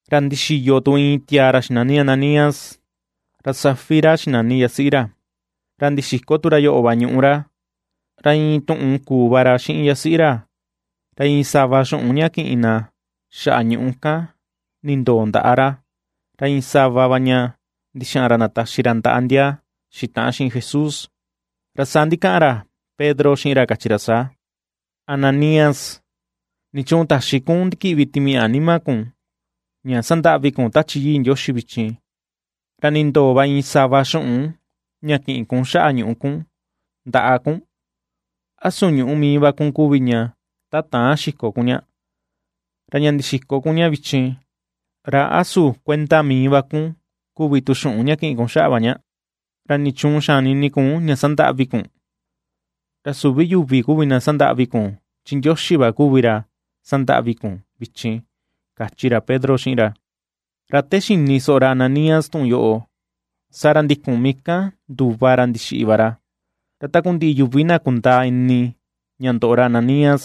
Ra ndixiyo tu iin tiaa ra xinani Ananías, ra Safira xinani yasiꞌi ra. Ra ndixiko tu ra yoꞌo va ñuꞌu ra. Ra iin tuꞌun kuu va ra xiꞌin yasiꞌi ra, ra iin sava xuꞌun ña kiꞌin ra xaꞌa ñuꞌu kan nindoo ndaꞌa ra, ra iin sava va ña ndixaꞌan ra ndataxi ra ndaꞌa ndia xitaꞌan xiꞌin Jesús. Ra saa ndikaꞌan ra Pedro xiꞌin ra kachi ra saa: ―Ananías, ¿nichuun taxi kun ndikiꞌvi Timiaꞌa nima kun, ña ^sandaꞌvi kun Tachi Yii Ndioxi vichin, ra nindoo va iin sava xuꞌun ña kiꞌin kun xaꞌa ñuꞌu kun ndaꞌa kun? ¿Ra a su ñuꞌú mii va kun kuvi ña ta täan xiko kun ña? Ra ña ndixiko kun ña vichin, ¿ra a su kuenda mii va kun kuvi tu xuꞌun ña kiꞌin kun xaꞌa va ña? ¿Ra nichuun xani ini kun ña sandaꞌvi kun? Ra süvi yuvi kuvi na ^sandaꞌvi kun, chi Ndioxi va kuvi ra ^sandaꞌvi kun vichin ―kachi ra Pedro xiꞌin ra. Ra te xini soꞌo ra Ananías tuꞌun yoꞌo, saa ra ndikun mii kan nduva ra ndixiꞌi va ra. Ra takundiꞌi yuvi na kundaa ini ña ndoꞌo ra Ananías,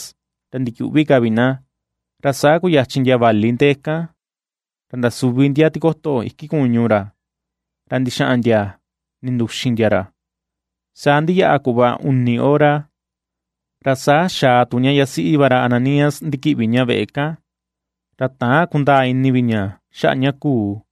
ra ndiyuꞌvi ka vi na. Ra saa kuyachin ndia vali ndee kan, ra ndasuvi ndia tikoto iki kuñu ra, ra ndixaꞌan ndia ninduxin ndia ra. Saa ndiyaꞌa kuꞌva uni hora, ra saa xaa tu ña yasiꞌi va ra Ananías ndikiꞌvi ña veꞌe kan, ra täan kundaa ini vi ña xaꞌa ña kuu.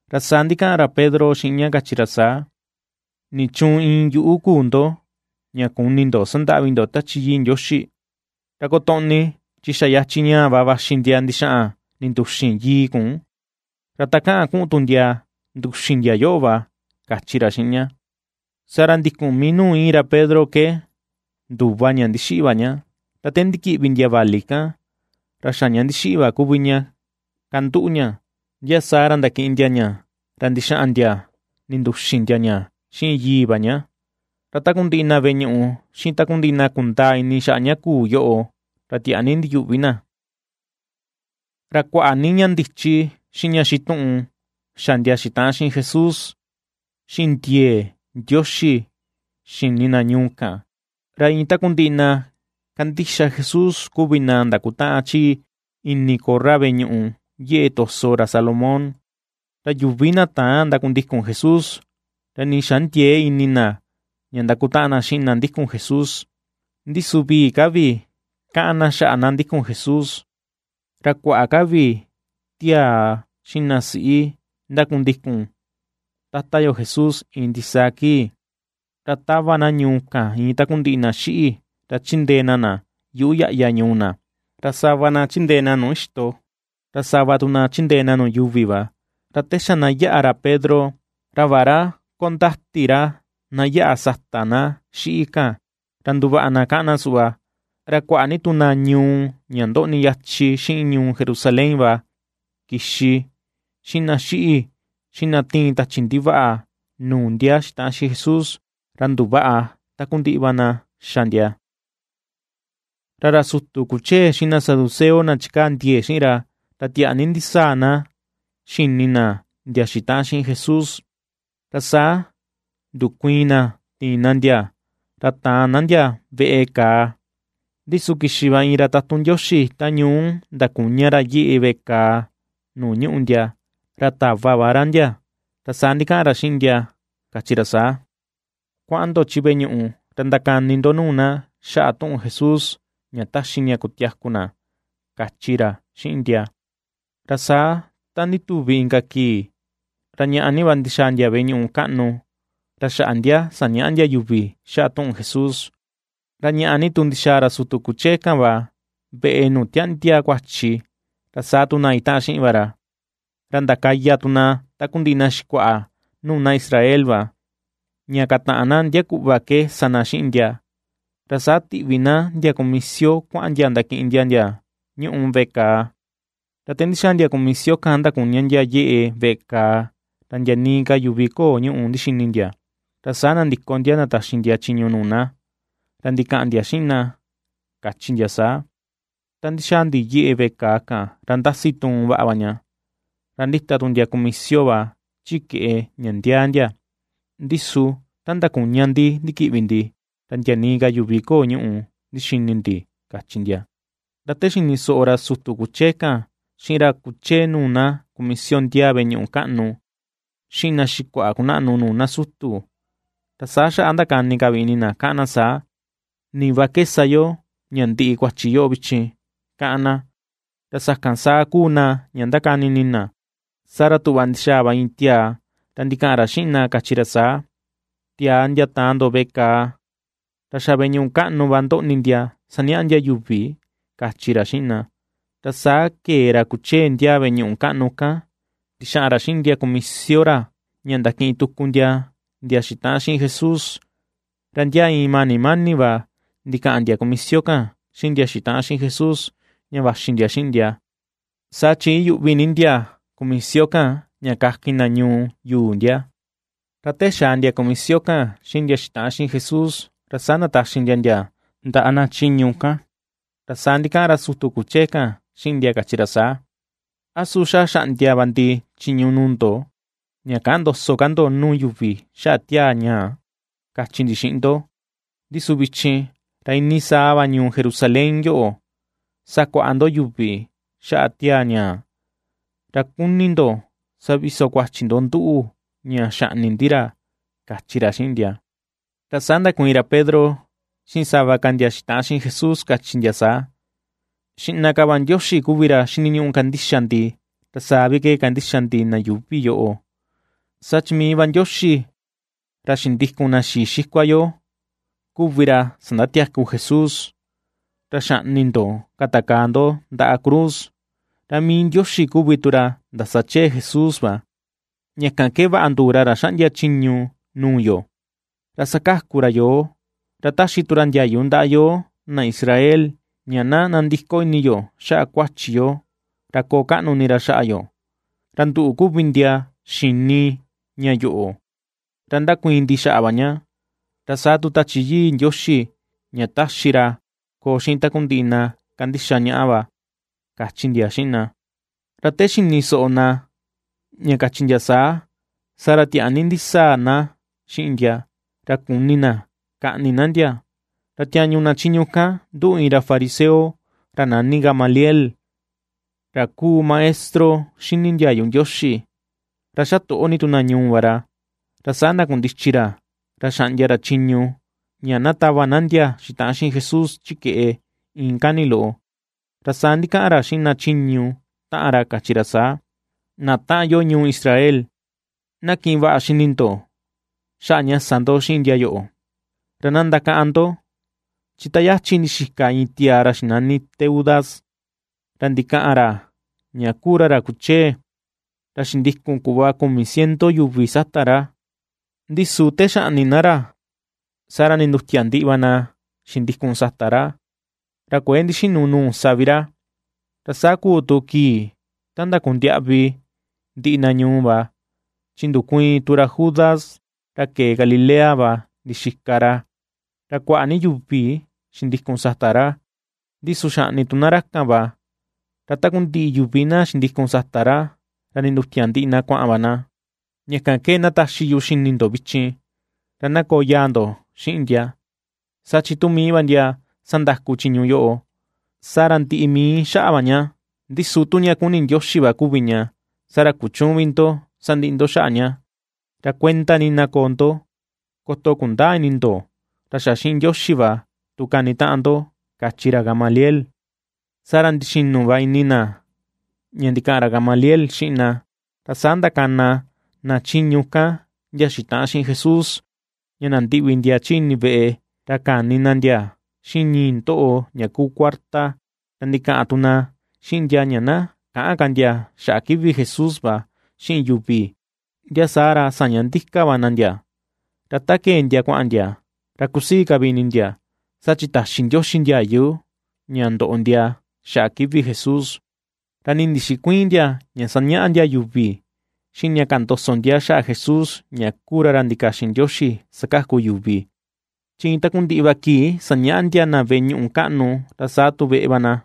Ra saa ndikaꞌan ra Pedro xiꞌin ña kachi ra saa: ―¿Nichuun iin yuꞌu kuu ndo ña kuni ndo sandaꞌvi ndo Tachi Yii Ndioxi? Ra kotoꞌni chi xa yachin ñaa va vaxi ndia ndixaꞌan ninduxin yii kun, ra takaꞌan kuꞌun tu ndia nduxin ndia yoꞌo va ―kachi ra xiꞌin ña. Saa ra ndikun mii nuu íin ra Pedro ke nduva ña ndixiꞌi va ña. Ra te ndikiꞌvi ndia vali kan, ra xa ña ndixiꞌi va kuvi ña kanduꞌu ña, ndia saa ra ndakiꞌin ndia ña ra ndixaꞌan ndia ninduxin ndia ña xiin yii va ña. Ra takundiꞌi na veꞌe ñuꞌu, xiꞌin takundiꞌi na kundaa ini xaꞌa ña kuu yoꞌo, ra tiaa ni ndiyuꞌvi na. Ra kuaꞌa ni ña ndichi xiꞌin ña xituꞌun xa ndia xitaꞌan Jesús xiꞌin ndiee Ndioxi xini na ñuu kan, ra iin takundiꞌi na kandixa Jesús kuvi na ndakutaꞌan chi ini korra veꞌe ñuꞌu yeꞌe to̱sò ra Salomón. Ra yuvi na täan ndakundikun Jesús, ra nii xandiëe ini na ña ndakutaꞌan na xiꞌin na ndikun Jesús, ndi su vii ka vi kaꞌan na xaꞌa na ndikun Jesús. Ra kuaꞌa ka vi tiaa xiꞌin na siꞌi ndakundikun Tata yo Jesús iin ndisaa kii. Ra tava na ñuu kan iin takundiꞌi na xiꞌi ra chindee na na yuꞌu yaꞌya ñuu na, ra sava na chindee nuu ixto ra sava tu na chindee na nuu yuuvi va, ra te xa na yaꞌa ra Pedro, ra vaꞌa ra kondati ra na yaꞌa sata na xiꞌi kan, ra nduvaꞌa na káꞌán na suꞌva. Ra kuaꞌa ni tu na ñuu ña ndoꞌni yachin xiꞌin ñuu Jerusalén va kixi xiꞌin na xiꞌi, xiꞌin na tiin tachi ndivaꞌa nuu ndia xitaꞌan xiꞌin Jesús, ra nduvaꞌa takundiꞌi va na xa ndia. Ra ra sutu kuchee xiꞌin na saduceo na chikaa ndiee xiꞌin ra, ra tiaa ni ndisaa na xini na ndia xitaꞌan xiꞌin Jesús, Ra saa ndukuiin na tiin na ndia ra taan na ndia veꞌe kàà. Ndi su kixi va iin ra tatun Ndioxi ta ñuu ndakuña ra yeꞌe veꞌe kaa nuu ñuꞌu ndia, ra tava va ra ndia, ra saa ndikaꞌan ra xiꞌin na kachi ra saa: ―Kuaꞌan ndo chi veꞌe ñuꞌu ra ndakani ndo nuu na xaꞌa tuꞌun Jesús ña taxi ña kutiaku na ―kachi ra xiꞌin ndia. Ra saa ta ndituvi inka kii, ra ñàꞌà ni va ndixaa ndia veꞌe ñuꞌu kaꞌnu, ra xaꞌa ndia sañaꞌa ndia yuvi xaꞌa tuꞌun Jesús. Ra ñàꞌà ni tu ndixaa ra sutu kuchee kan va veꞌe nuu tiaꞌndia kuachi ra saa tu na itaꞌan xiꞌin va ra, ra ndakaya tu na takundiꞌi na xikuaꞌa nuu na Israel va, ña kataꞌan na ndia kuꞌva ke sa na xiꞌin ndia, ra saa tiꞌvi na ndia kumisio kuaꞌan ndia ndakiꞌin ndia ndia ñúꞌu veꞌe kaa. Ra te ndixaa ndia kumisio kan ndakuña ndia yeꞌe veꞌe kaa ra ndia nii ka yuvi köo ñúꞌu ndixini ndia, ra saa nandiko ndia ndataxi ndia chiñu nuu na, ra ndikaꞌan ndia xiꞌin na kachi ndia saa: ―Ta ndixaa ndi yeꞌe veꞌe kaa kan ra ndasi tuun vaꞌa va ña, ra ndita tu ndia kumisio va chikeꞌe ña ndiaa ndia, ndi su ta ndakuña ndi ndikiꞌvi ndi, ra ndia nii ka yuvi köo ñúꞌu ndixini ndi ―kachi ndia. Ra te xini soꞌo ra sutu kuchee kan xiꞌin ra kuchee nuu na kumisio ndiaa veꞌe ñuꞌu kaꞌnu, xiꞌin na xikuaꞌa kunaꞌnu nuu na sutu, ra saa xaꞌa ndakani ka vi ini na káꞌán na saa: “Ni va ke sa yo ña ndiꞌi kuachi yoꞌo vichin”, káꞌán na. Ra sakan saa kuu na ña ndakani ini na, saa ra tuꞌva ndixaa va iin tiaa ra ndikaꞌan ra xiꞌin na kachi ra saa: ―Tiaa ndia taan ndo veꞌe kaa ra xa veꞌe ñuꞌu kaꞌnu va ndoꞌni ndia sañaꞌa ndia yuvi ―kachi ra xiꞌin na. Ra saa kee ra kuchee ndiaa veꞌe ñuꞌu kaꞌnu kan, ndixaꞌan ra xiꞌin ndia kumisio ra ña ndakiꞌin tuku ndia ndia xitaꞌan xiꞌin Jesús, ra ndia iin mani mani va ndikaꞌan ndia kumisio kan xiꞌin ndia xitaꞌan xiꞌin Jesús ña vaxi ndia xiꞌin ndia, saa chi iyuꞌvi ni ndia kumisio kan ña kakin na ñuu yuu ndia. Ra te xaa ndia kumisio kan xiꞌin ndia xitaꞌan xiꞌin Jesús ra saa ndataxi ndia ndaꞌa na chiñu kan, ra saa ndikaꞌan ra sutu kuchee kan xiꞌin ndia kachi ra saa: ―A su xa xaꞌndia va ndi chiñu nuu ndo ña käꞌan ndoso ka ndo nuu yuvi xaꞌa tiaa ñaa, kachi ndi xiꞌin ndo; ndi su vichin ra iinii saa va ñuu Jerusalén yoꞌo sakuaꞌa ndo yuvi xaꞌa tiaa ñaa, ra kuni ndo saviso kuachi ndo nduꞌu ña xaꞌni ndi ra ―kachi ra xiꞌin ndia. Ra saa ndakuiin ra Pedro xiꞌin sava ka ndia xitaꞌan xiꞌin Jesús kachi ndia saa: ―Xiꞌna ka va Ndioxi kuvi ra xiniñuꞌu kandixa ndi, ra saa vi ke kandixa ndi na yuuvi yoꞌo. Saa chi mii va Ndioxi ra xindikun na xii xikua yo kuvi ra sandatiaku Jesús, ra xaꞌni ndo katakaa ndo ndaꞌa cruz. Ra mii Ndioxi kuvi tu ra ndasachee Jesús va, ña kan ke vaꞌa nduu ra ra xaꞌndia ra chiñu nuu yo, ra sakaku ra yoo, ra ^taxi tu ra ndiayu ndaꞌa yoo na Israel, ña na nandiko ini yo xaꞌa kuachi yo ra koo kaꞌnu ini ra xaꞌa yo. Ra nduꞌu kuvi ndia xini ña yoꞌo ra ^ndakuiin ndi xaꞌa va ña, ra saa tu Tachi yii Ndioxi ña taxi ra koo xiꞌin takundiꞌi na kandixa ñaꞌa va ―kachi ndia xiꞌin na. Ra te xini soꞌo na ña kachi ndia saa, saa ra tiaa ni ndisaa na xiꞌin ndia, ra kuni na kaꞌni na ndia. Ra tiañu na chiñu kan nduꞌu iin ra fariseo ra nani Gamaliel, ra kuu maestro xini ndiayu Ndioxi, ra xa toꞌo ni tu na ñuu va ra. Ra saa ndakundichi ra ra xaꞌndia ra chiñu, ña na tava na ndia xitaꞌan xiꞌin Jesús chi keꞌe iin kani loꞌo. Ra saa ndikaꞌan ra xiꞌin na chiñu taꞌan ra kachi ra saa: ―Na taꞌan yo ñuu Israel, na kiꞌin vaꞌa xini ndo xaꞌa ña sa ndo xiꞌin ndia yoꞌo. Ra na ndakaꞌan ndo, chi ta yachi ndixika iin tiaa ra xinani Teudas, ra ndikaꞌan ra ña kuu ra ra kuchee, ra xindikun kuꞌva kumi ciento yuvi sata ra. Ndi su te xaꞌni na ra saa ra nindutia ndiꞌi va na xindikun sata ra, ra kuë ndixinu nuu sa vi ra. Ra saa kuu tu kii ta ndakondiaꞌvi ndiꞌi na ñuu va, chi ndukuiin tu ra Judas ra kee Galilea va ndixika ra, ra kuaꞌa ni yuvi xindikun sata ra; ndi su xaꞌni tu na ra kan va, ra takundiꞌi yuvi na xindikun sata ra ra nindutia ndiꞌi na kuaꞌan va na. Ña kan ke ndataxi yu xini ndo vichin, ra na koo yaa ndo xiꞌin ndia. Saa chi tu mii va ndia sandaku chiñu yoꞌo, saa ra ndiꞌi mii xaꞌa va ña. Ndi su tu ña kuni Ndioxi va kuvi ña, saa ra kuchüun vi ndo sandiꞌi ndo xaꞌa ña. Ra kuenda ni na koo ndo, koto kundäa ini ndo ra xa xiꞌin Ndioxi va tu kanitaꞌan ndo ―kachi ra Gamaliel. Saa ra ndixinu va ini na ña ndikaꞌan ra Gamaliel xiꞌin na. Ra saa ndakana na chiñu kan ndia xitaꞌan xiꞌin Jesús ña nandiꞌvi ndia chi ini veꞌe, ra kani na ndia xiꞌin ñii ndoꞌo ña kuu kuarta, ra ndikaꞌan tu na xiꞌin ndia ña na käꞌan ka ndia xaꞌa kivi Jesús va xiꞌin yuvi, ndia saa ra saña ndika va na ndia. Ra ta kee ndia kuaꞌan ndia, ra kusii ka vi ini ndia saa chi taxi Ndioxi ndiayu ña ndoꞌo ndia xaꞌa kivi Jesús. Ra nii ndixikuïin ndia ña sañaꞌa ndia yuvi, xiꞌin ña kaꞌan ndoso ndia xaꞌa Jesús ña kuu ra ra ndikaxin Ndioxi sakaku yuvi, chi iin takundiꞌi va kii sañaꞌa ndia na veꞌe ñuꞌu kaꞌnu, ra saa tu veꞌe va na.